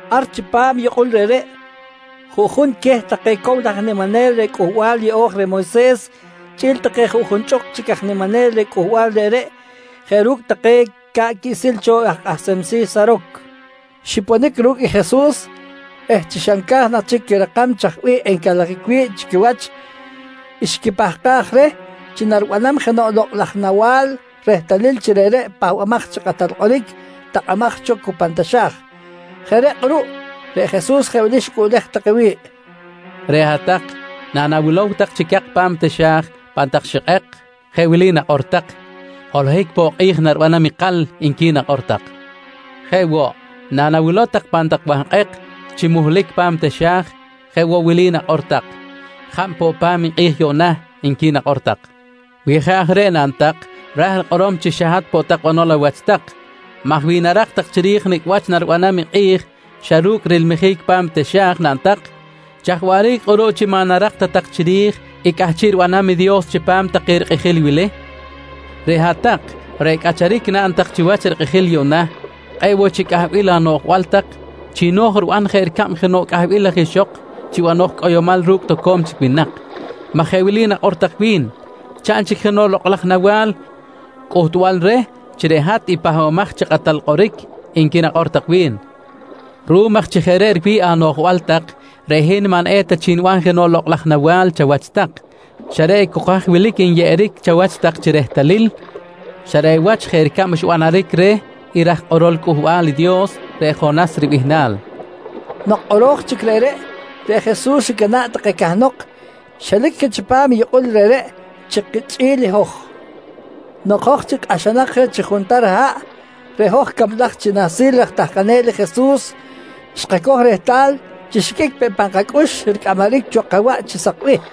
Ar chipam i yukꞌul reꞌreꞌ, juꞌjun queh take cow laj aj niminel reh Cꞌuhbal Yeꞌo̱j reh Moyses chꞌi̱l take junchꞌuk chic aj niminel reh cꞌuhbal reꞌreꞌ jeꞌ ru̱cꞌ take ca̱ꞌ quiꞌsil cho aj kꞌahsem si̱ Saroc, xiponic ru̱cꞌ Jesus eh chi xa nca̱j nak chic quirakam chaj bih encalajic wi̱ꞌ chi quiwach, xquipahkaj reh chi naribanam jenoꞌ lokꞌ laj nawa̱l rehtalil chi reꞌreꞌ i Pahbamaj chi Kꞌatal Kꞌoric takꞌamaj cho cu pan taxa̱j. Jeꞌ reꞌ kꞌuruꞌ, reꞌ Jesus jeꞌ wili xicꞌuꞌlej take wi̱ꞌ: «Reꞌ hat-tak, nanawilow tak chi cak pa̱m i taxa̱j pan tak xikꞌek, jeꞌ wili nakꞌor tak: ‹Holohic poꞌ kꞌi̱j naribanam ikal, nqui nakꞌor tak. «Jeꞌ woꞌ, nanawilow tak pan tak wahkꞌek chi muhlic pa̱m i taxa̱j, jeꞌ woꞌ wili nakꞌor tak: ‹Jab poꞌ pa̱m i kꞌi̱j yuꞌna, nqui nakꞌor tak. «Wi jeꞌ aj reꞌ naꞌn tak, ra̱j rikꞌorom chi xa hat poꞌ tak banol awach tak maj wi narak tak chiri̱j nicꞌ wach naribanam i kꞌi̱j xa ru̱cꞌ rilmijic pa̱m i taxa̱j naꞌn tak, chaj waꞌric kꞌuruꞌ chi maꞌ narak ta tak chiri̱j i cꞌahchiꞌ ribanam i Dios chipam take rikꞌijil wili? Reꞌ hat-tak reꞌ cꞌacharic naꞌn tak chiwach rikꞌijil yuꞌna kꞌe̱ꞌ woꞌ chic cꞌahbil anoꞌjbal tak chi no̱j riban jeꞌ ricab jenoꞌ cꞌahbil laj ixok chi banoj cꞌoyomal ru̱cꞌ toco̱m chic winak, maj jeꞌ wili nakꞌor tak wi̱n: ‹Chaꞌn chic jenoꞌ lokꞌ laj nawa̱l cꞌuhtbal reh chi reꞌ hat i Pahbamaj chi Kꞌatal Kꞌoric, nqui nakꞌor tak wi̱n. «Ruꞌum aj chi jeꞌ reꞌ riwi̱ꞌ anoꞌjbal tak, reꞌ hin maꞌ eta chic niban jenoꞌ lokꞌ laj nawa̱l chawach tak, xa reꞌ cok haj wilic enyeꞌeric chawach chi rehtalil, xa reꞌ wach jeꞌ ricab xbanaric reh i raj kꞌorol Cꞌuhbal i Dios, reꞌ Jonas ribihnal, nqui queh. Nok kꞌoro̱j chic reꞌreꞌ, reꞌ Jesus xicana̱ꞌ take cahnok, xelic je chipam i yukꞌul reꞌreꞌ chi kichꞌi̱l i hoj. Nok hoj chic kꞌahxanak je chi juntar haꞌ, reꞌ hoj cablaj chi nahsil raj tahkanel i Jesus xkacoj rehtal chi xiqꞌuic peꞌ pan kacꞌux ricꞌamaric cho kawaꞌ chi sak bih.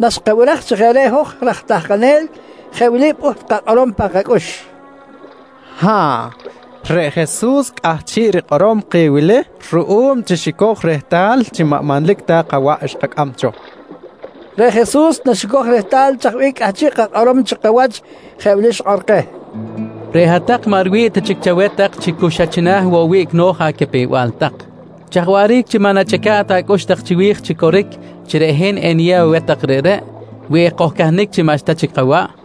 Naxkabiraj chi jeꞌ reꞌ i hoj raj tahkanel, jeꞌ wili pꞌuht kakꞌorom pan kacꞌux: «Ha̱ꞌ, reꞌ Jesus cꞌahchiꞌ rikꞌorom keh wili ruꞌum chi xicoj chic rehtal chi maꞌ manlic ta kawaꞌ xkacꞌam cho, nqui pꞌuht kakꞌorom. Reꞌ Jesus naxicoj rehtal chaj bih cꞌahchiꞌ kakꞌorom chikawach jeꞌ wili xikꞌor keh: «Reꞌ hat-tak maꞌ riwi̱ꞌ ta chic chaweh tak chi xa cu china̱ woꞌ i wiꞌc no̱j acapew-bal tak. Chaj waꞌric chi maꞌ nachꞌica̱ꞌ tak acꞌux tak chiwi̱j chi coric chi reꞌ hin eniyew aweh tak reꞌreꞌ, wi ekojcahnic chi maꞌxta chic kawaꞌ?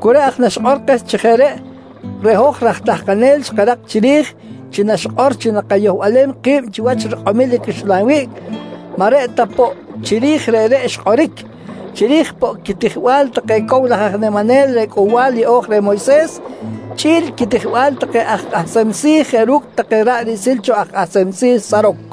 Cu reꞌ aj naxikꞌor keh chi jeꞌ reꞌ, reꞌ hoj raj tahkanel xkarak chiri̱j chi naxikꞌor chi nakayohbalem ki̱b chiwach rikꞌomil i caxlan wiꞌc, maꞌ reꞌ ta poꞌ chiri̱j reꞌreꞌ xkꞌoric, chiri̱j poꞌ i quitijbal take cow laj aj niminel reh Cꞌuhbal Yeꞌo̱j reh Moyses chꞌi̱l quitijbal take aj kꞌahsem si̱ jeꞌ ru̱cꞌ take ra̱ꞌ riꞌsil cho aj kꞌahsem si̱ Saroc.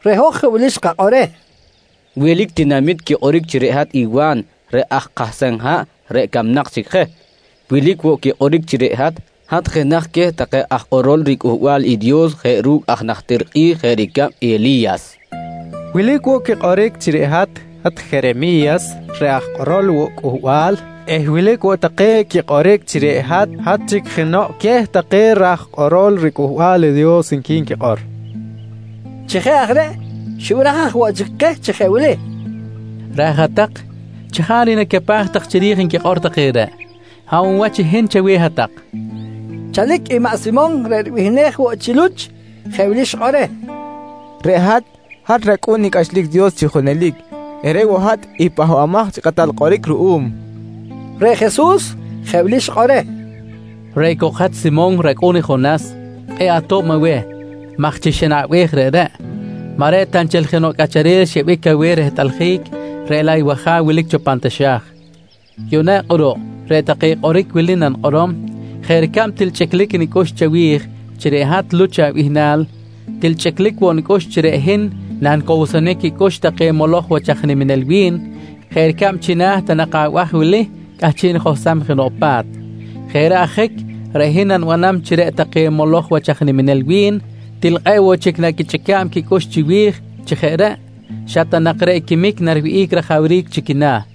Reꞌ hoj jeꞌ wili xkakꞌor reh: «Wilic tinamit quikꞌoric chi reꞌ hat i Wa̱n reꞌ aj kahsem haꞌ reꞌ camnak chic je. Wilic woꞌ quikꞌoric chi reꞌ hat, hat jenaj queh take aj kꞌorol riCꞌuhbal i Dios jeꞌ ru̱cꞌ aj najtir kꞌi̱j jeꞌ ricab i Eli̱yas. Wilic woꞌ quikꞌoric chi reꞌ hat, hat i Jeremi̱yas reꞌ aj kꞌorol woꞌ Cꞌuhbal eh wilic woꞌ take quikꞌoric chi reꞌ hat, hat chic jenoꞌ queh take raj kꞌorol riCꞌuhbal i Dios, nqui nquikꞌor, kojqui reh. Chi jeꞌ aj reꞌ, xibiraj aj woꞌ chic keh chi jeꞌ wili: «Raj hat-tak, chajaric nacapaj chiri̱j nquikꞌor take reꞌ? Hab woꞌ wach i hin chaweh hat-tak? nqui keh. Chalic i maꞌ Simon reꞌ ribihnej woꞌ chi Luch, jeꞌ wili xikꞌor reh: «Reꞌ hat, hat rAcꞌu̱n i cꞌachlic Dios chi junelic eh reꞌ woꞌ hat i Pahbamaj chi Kꞌatal Kꞌoric ruꞌum, nqui reh. Reꞌ Jesus, jeꞌ wili xikꞌor reh: «Reꞌ cok i hat Simon racꞌu̱n i Jonas, kꞌe̱ꞌ ato̱b aweh maj chi xanaꞌbej reꞌreꞌ, maꞌ reꞌ ta nchel jenoꞌ cꞌacharel xyeꞌbic aweh rehtꞌaljic, reꞌ laꞌ i wAja̱w wilic cho pan taxa̱j. Yuꞌna kꞌuruꞌ, reꞌ take kꞌoric wili nanikꞌorom: Jeꞌ ricab til chꞌiclic nicꞌux chawi̱j chi reꞌ hat Luch abihnal, til chꞌiclic woꞌ nicꞌux chi reꞌ hin nanicowsonic quicꞌux take moloj wach aj niminel wi̱n jeꞌ ricab chi china̱ ta nak abaj wili, cꞌahchiꞌ nijohsam jenoꞌ pa̱t. Jeꞌ reꞌ ajic, reꞌ hin nanibanam chi reꞌ take moloj wach aj niminel wi̱n til kꞌe̱ꞌ woꞌ chic naquichꞌica̱b quicꞌux chiwi̱j eh chi jeꞌ reꞌ, xa ta nak reꞌ quimic nariwihꞌic rajawric chi quina̱.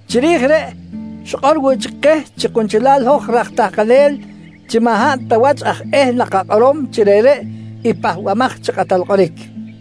Chiri̱j reꞌ, xikꞌor woꞌ keh chi kunchelal i hoj raj tahkanel chi maꞌ hab ta wach aj eh nakakꞌorom chi reꞌreꞌ i Pahbamaj chi Kꞌatal Kꞌoric.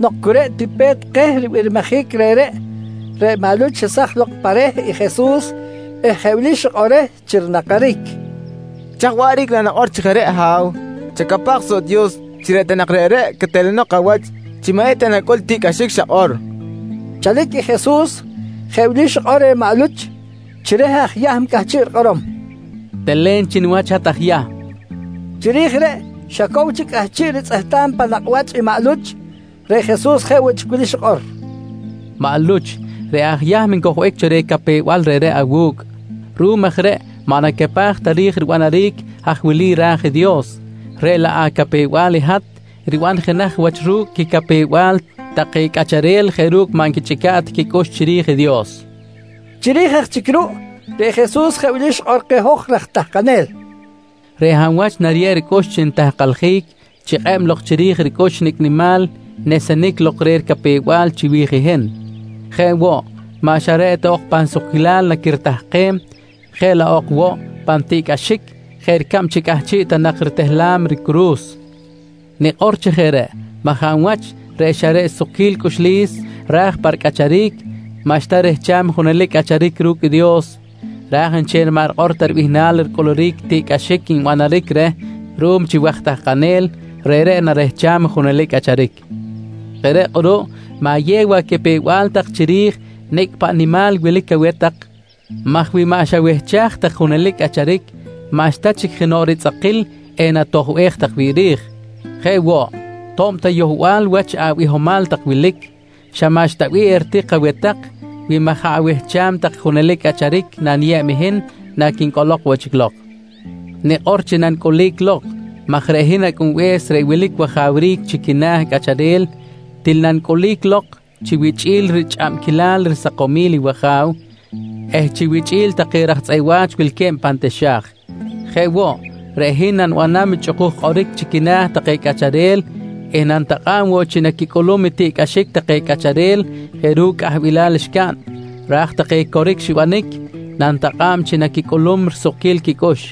Nok cu reꞌ ti pe̱t keh ribirmijic reꞌreꞌ, reꞌ maꞌ Luch xesaj lok pa reh i Jesus eh jeꞌ wili xikꞌor reh chi rinakaric: «Chaj waꞌric nanakꞌor chi jeꞌ reꞌ, Ha̱w! Chacapaj soꞌ i Dios chi reꞌ ta nak reꞌreꞌ quetelenok awach chi maꞌ eta nacꞌul i tiꞌcꞌaxic xakꞌor, nqui reh. Chalic i Jesus, jeꞌ wili xikꞌor reh maꞌ Luch chi reh aj Yahm cꞌahchiꞌ rikꞌorom: «Telen chi niwach hat aj Yahm, nqui xikꞌor. Chiri̱j reꞌ xa cow chic cꞌahchiꞌ ritzꞌehtam pan nakꞌ wach i maꞌ Luch, reꞌ Jesus jeꞌ woꞌ chic wili xikꞌor: «Maꞌ Luch, reꞌreꞌ aj Yahm ncojbic cho reh capew-bal reꞌreꞌ awu̱cꞌ. Ruꞌum aj reꞌ maꞌ nacapaj ta ri̱j ribanaric haj wilic ra̱j i Dios, reꞌ laꞌ acapew-bal i hat riban jenaj wach ru̱cꞌ quicapew-bal take cꞌacharel jeꞌ ru̱cꞌ maꞌ nquichꞌica̱ꞌ ta quicꞌux chiri̱j i Dios, nqui Jesus reh. Chiri̱j aj chic ruꞌ, reꞌ Jesus jeꞌ wili xikꞌor keh hoj raj tahkanel: «Reꞌ hab wach nariyeb ricꞌux chi nitahkaljic chikꞌeb lok rij ricꞌux nicꞌ nimal nesenic lok reh ricapew-bal chiwi̱j i hin. Jeꞌ woꞌ, maꞌ xa reꞌ ok pan sukquilal naquiritahkem, jeꞌ laꞌ ok woꞌ pan tiꞌcꞌaxic jeꞌ ricab chi cꞌahchiꞌ ta nak ritehlam ricuru̱s. Nikꞌor chi jeꞌ reꞌ maj hab wach reꞌ xa reꞌ sukquil cꞌuxlis ra̱j pa ricꞌacharic, maꞌxta rehcham i junelic cꞌacharic ru̱cꞌ i Dios, raj nchel i maꞌ rikꞌor ta bihnal ricꞌuluric i tiꞌcꞌaxic nbanaric reh ruꞌum chi waj tahkanel, reꞌreꞌ narehcham i junelic cꞌacharic. Jeꞌ reꞌ kꞌuruꞌ, ma̱yew acapew-bal tak chiri̱j nicꞌ paꞌ nimal wilic aweh tak maj wi maꞌ xawehchaj tak i junelic cꞌacharic maꞌxta chic jenoꞌ ritzꞌakil enatojbej tak wi̱ꞌ ri̱j. Jeꞌ woꞌ, to̱b ta yohbal wach abihomal tak wili, xa maꞌxta bih eritik aweh tak, wi maꞌ jaꞌ awehcham tak i junelic cꞌacharic naniyeb i hin naquincꞌolok woꞌ chic lok. Nikꞌor chi nanicꞌulic lok maj reꞌ hin Acꞌunbe̱s reꞌ wilic wajawric chi quina̱ cꞌacharel til nanicꞌulic lok chi wichꞌi̱l richꞌabquilal risakomil i wAja̱w eh chi wichꞌi̱l take raj tzꞌeꞌ wa̱ch wilque̱b pan taxa̱j. Jeꞌ woꞌ, reꞌ hin nanibanam chꞌukuj kꞌoric chi quina̱ take cꞌacharel eh nanitakꞌa̱b woꞌ chi naquicꞌulum i tiꞌcꞌaxic take cꞌacharel jeꞌ ru̱cꞌ cꞌahbilal xcaꞌn. Raj take coric xibanic, nanitakꞌa̱b chi naquicꞌulum risukquil quicꞌux.